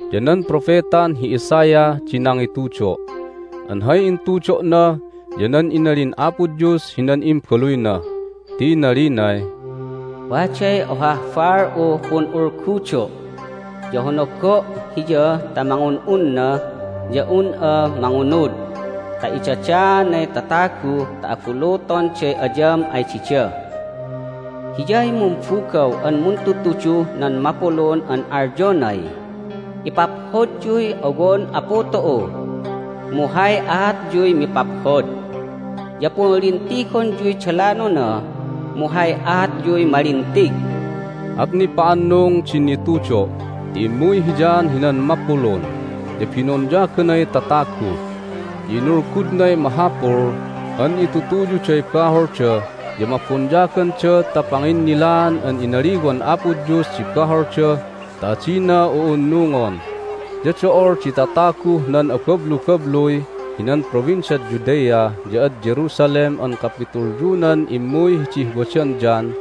ya nan propetan hi Isaiah di nangitudo', an hay intudo'na ya nan inalin Apo Dios hinan Imbaluyna, ti inalinay, "Waday ohah baal'uh pun'ulgudo', ya honogo' hiya ta mangun'unna ya un'a mangunud ta idadaanay tatagu ta abulutonday ayam ay dida. Hiyay mumbugaw an muntudtuduh nan mapulun an alyonay, Ipaphodyuy owon Apu tu'u, mu hay aatyuy mipaphod. Ya punlintigonyuy dalanona, mu hay aatyuy malintig!" At nipa'annung din nitudo' ti immuy hi John hinan mapulun, ya binonyaganay tatagu, ya inulgudnay mahapul an itutuyuday baholda ya mabonyaganda ta panginnilaan an inaliwan Apo Dios di baholda ta adina u'unnungon. Ya do'ol di tataguh nan abablubabluy hinan Provinciad Judea ya ad Jerusalem an kapitulyunan immuy hidih wadan John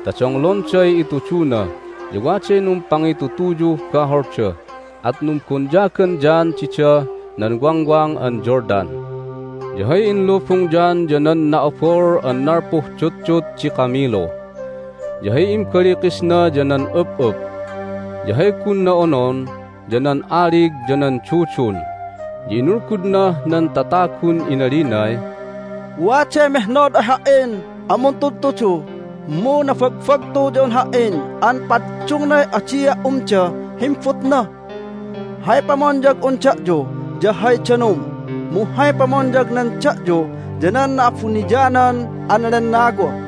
ta donglonday ituduna. Ya waday numpangitutuyuh baholda, at numbonyagan John didah nan Wangwang an Jordan. Ya hay inlubung John ya nan na'abol an nalpuh dutdut di kamilu, ya hay imbalikisna ya nan up'up, ya hay gunna onon ya nan alig ya nan dudun. Ya inulgudnah nan tatagun inalinay, "Waday mehnod ay ha"in an muntudtudu, mu nabagbagtu ya un ha"in an paddungnay adia' umdah himbutna. Hay pamonyag'un da'yu ya hay danum, mu hay pamonyagnan da'yu ya nan Na'abuniyanan an Lennawa."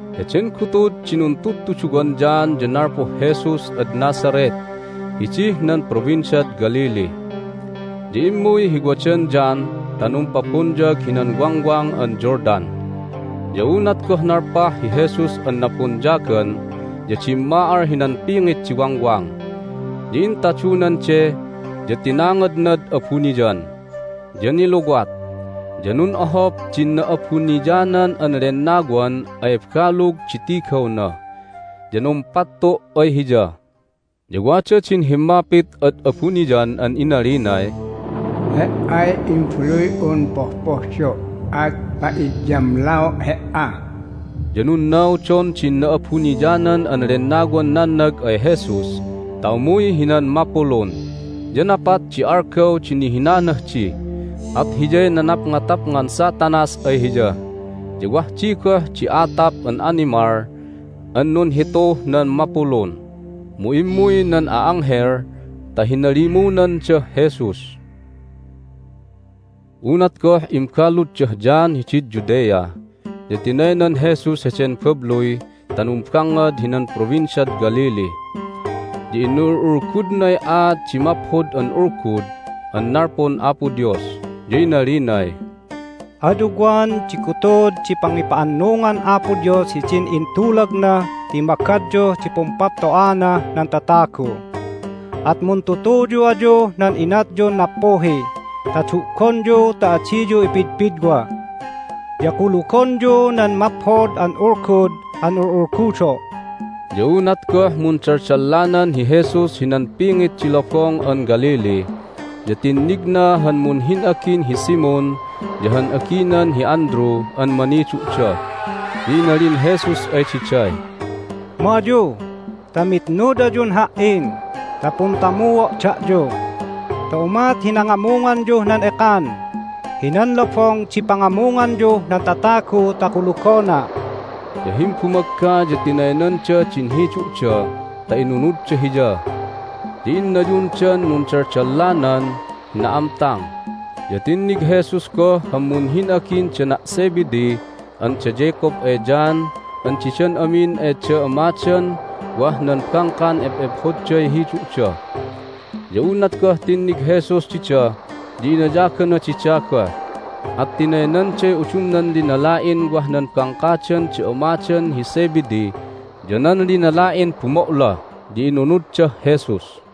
Heden gutud di nuntudtuduwan John ya nalpuh Jesus ad Nazareth hidih nan Provinciad Galilee, ya immuy hi wadan John ta numpabonyag hinan Wangwang an Jordan. Ya unat goh nalpah hi Jesus an nabonyagan ya dimma'al hinan pingit di wangwang, ya intadunan de, ya tinangadnad abuniyan. Ya niluwat, ya nun'ohop din Na'abuniyanan an Lennawan ay balug di tigawna, ya numpattu' ay Hiya. Ya wada din himmapit ad abuniyan an inalinay, "He"ay Imbaluy'un pohpohdo', at pa'idyamlao' He"a." Ya nunnaudon din Na'abuniyanan an Lennawan nannag ay Jesus ta umuy hinan mapulun. Ya napat di algaw di nihinanah di, at hiyay nanapngatapngan Satanas ay Hiya. Ya wah di goh di atap an animal an nunhituh nan mapulun, mu immuy nan a'anghel ta hinalimunandah Jesus. Unat goh imbaluddah John hidid Judea ya tinaynan Jesus heden babluy ta numbangngad hinan Provinciad Galilee. Ya inul'ulgudnay aat di Maphod an Ulgud an nalpun Apo Dios, ya inalinay, "Ad ugwan di gutud di pangipa'annungan Apo Dios hidin intulagna ti magadyuh di pumpapto'anah nan tatagu! At muntutuyu ayuh nan inatyun nappuhi ta du'gonyu ta adiyu ipidpidwa, ya kulugonyu nan Maphod an Ulgud an ul'ulgudo'!" Ya unat goh mundaldallanan hi Jesus hinan pingit di Lobong an Galilee ya tinnigna han munhin'agin hi Simon ya han aginan hi Andrew an manidu'da. Ya inalin Jesus ay diday, "Ma ayu ta mitnud ayun Ha"in ta puntamuo' da'yu ta umat hi nangamunganyuh nan ekan hinan lobong di pangamunganyuh nan tatagu ta kulugona'!" Ya himbumagga ya tinaynanda din hidu'da ta inunudda Hiya. Ya innayunan nundaldallanan hi na'amtang, ya tinnig Jesus goh han munhin'agin dana' Zebedee an da Jacob ay John an didan amin ay da amadan wah nan bangkan ep'ephodday hidu'da. Ya unat goh tinnig Jesus dida ya inayagana dida goh, at tinaynanday udumnan linala'in wah nan bangkadan da amadan hi Zebedee ya nan linala'in bumo'la, ya inunuddah Jesus.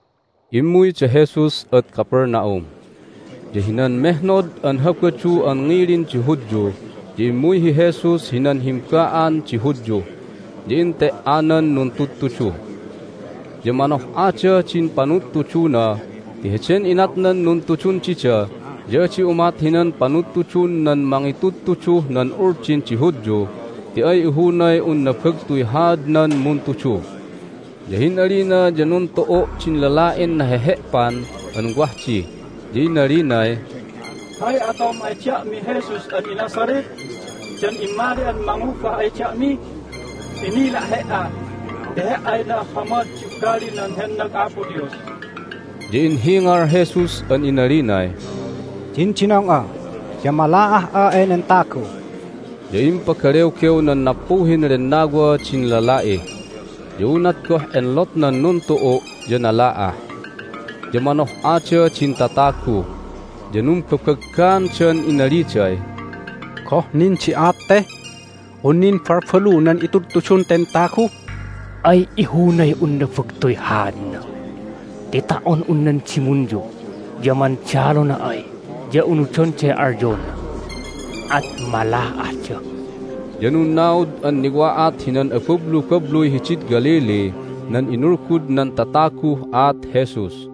Immuy da Jesus ad Capernaum. Ya hinan mehnod an Habadu an ngilin di Hudyu ya immuy hi Jesus hinan himba'an di Hudyu, ya ente"anan nuntudtudu. Ya manoh'adah din panudtuduna ti heden inatnan nuntudun dida ya adi umat hinan panudtudun nan mangitudtuduh nan Uldin di Hudyu ti ay ihunay un nabagtuy haadnan muntudu. Ya hin'alina ya nuntu'u' din lala'in nahehe'pan an wah di, ya inalinay, "Hay atom ay da'mi, Jesus an iNazareth? Dan immali'an mangubah ay da'mi? Inila' He"a ti He"ay na'ahhamad di ugalinan hennag Apo Dios!" Ya inhingal Jesus an inalinay, "Dindinong'a, ya mala'ah'a enen tagu!" Ya impagalewgew nan nappuhin lennawa din lala'i. Ya unat goh enlotnan nuntu'u' ya nala'ah. Ya manoh'ada din tatagu, ya numbabaggaandan inaliday, "Goh nin di aat te? Un nin balbalu nan itudtudun ten tagu? Ay ihunay un nabagtuy haadna ti ta"on un nan dimunyu ya mandalona ay ya unudonday alyona, at mala'ahda!" Ya nunnaud an niwa'at hinan abablubabluy hidid Galilee nan inulgud nan tataguh aat Jesus.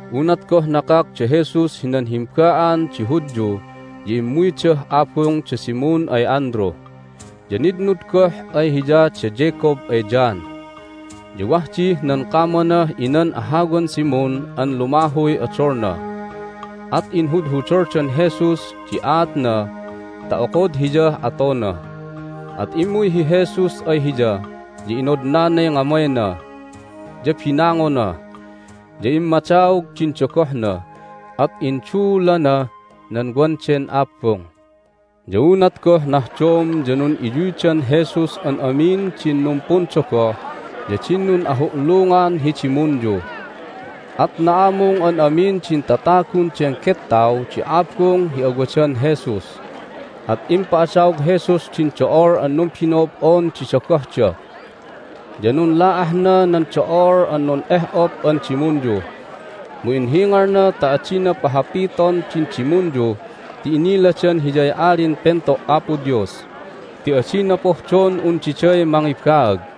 Unat goh nakak da Jesus hinan himba'an di Hudyu ya immuydah abung da Simon ay Andrew. Ya nitnud goh ay Hiya da Jacob ay John. Ya wah dih nan kamanah inan ahawan Simon an lumahuy odolna, at inhudhudoldan Jesus di aatna ta okod Hiyah atona. At immuy hi Jesus ay hiya, ya inodnanay ngamayna, ya binangona. Ya immadaog din dogohna, at induulana nan wan den abung. Ya unat goh nahdom ya nun'iyuydan Jesus an amin din numpundogoh ya din nun'ahu'lungan hi dimunyu. At na'amung an amin din tatagun den gettaw di abung hi awadan Jesus. At impa'adaog Jesus din do'ol an numbino'ob'on di dogohda, ya nunla'ahna nan do'ol an nun'eh'op an dimunyu. Mu inhingalna ta adina pahapiton din dimunyu ti iniladan Hiyay Alin Pento' Apo Dios, ti adina pohdon un diday mangibaag.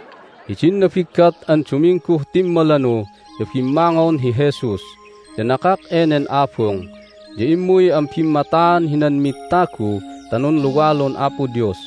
Hidin nabiggat an Dumingguh timmalanu ya bimmangon hi Jesus, ya nakak enen abung, ya immuy an bimmataan hinan mid tagu ta nunluwalun Apo Dios.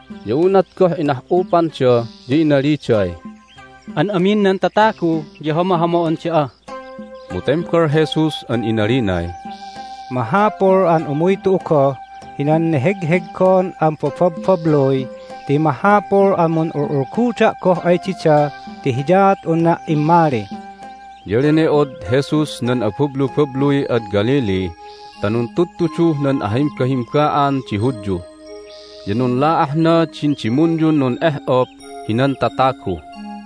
Ya unat goh inah'upanda ya inaliday, "An amin nan tatagu ya hamahama'on da'a!" Mu tembal Jesus an inalinay, "Mahapul an umuy tu'u goh hinan nehegheggon an bababbabluy ti mahapul an mun'ul'ulguda' goh ay dida ti hiyaat unna' immali." Ya lene'od Jesus nan abablubabluy ad Galilee ta nuntudtuduh nan ahimbahimba'an di Hudyu, ya nunla'ahna din dimunyun nun'eh'op hinan tatagu.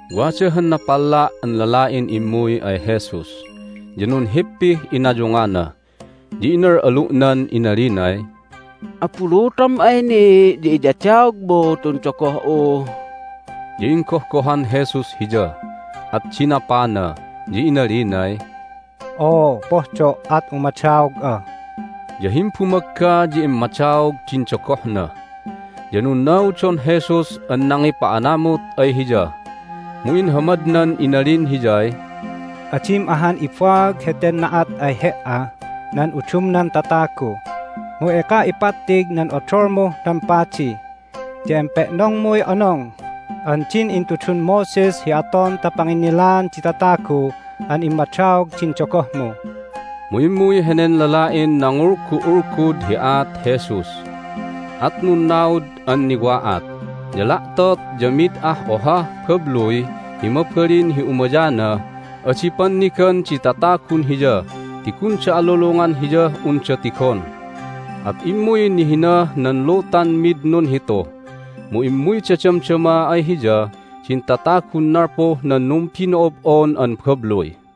Wada han napalla' an lala'in immuy ay Jesus, ya nunhippih inayungana, ya inal'alu'nan inalinay, "Abulutom ay ni' ya iyadaogmu tun dogoh'u." Ya inggohgohan Jesus hiya, at dinapana, ya inalinay, "Oo, pohdo', at umadaog'a!" Ya himbumagga ya immadaog din dogohna. Ya nunnaudon Jesus an nangipa'anamut ay hiya, mu inhamad inalin hiyay, "Adim ahan ibaag heten na'at ay he"ah nan udumnan tatagu, mu eka ipattig nan odolmuh nan padi, ya empe'nongmuy onong an din intudun Moses hi aton ta panginnilaan di tatagu an immadaog din dogohmu." Mu immuy henen lala'in nangulgu'ulgud hi aat Jesus, at nunnaud an niwa'at, ya la'tot ya mid ah ohah babluy hi mabalin hi umayanah adi pannigan di tatagun Hiya ti gunda alulungan Hiyah unda tigon. At immuy nihinah nan lutan mid nunhitu, mu immuyda damdama ay Hiya din tatagun nalpuh nan numbino'ob'on an babluy.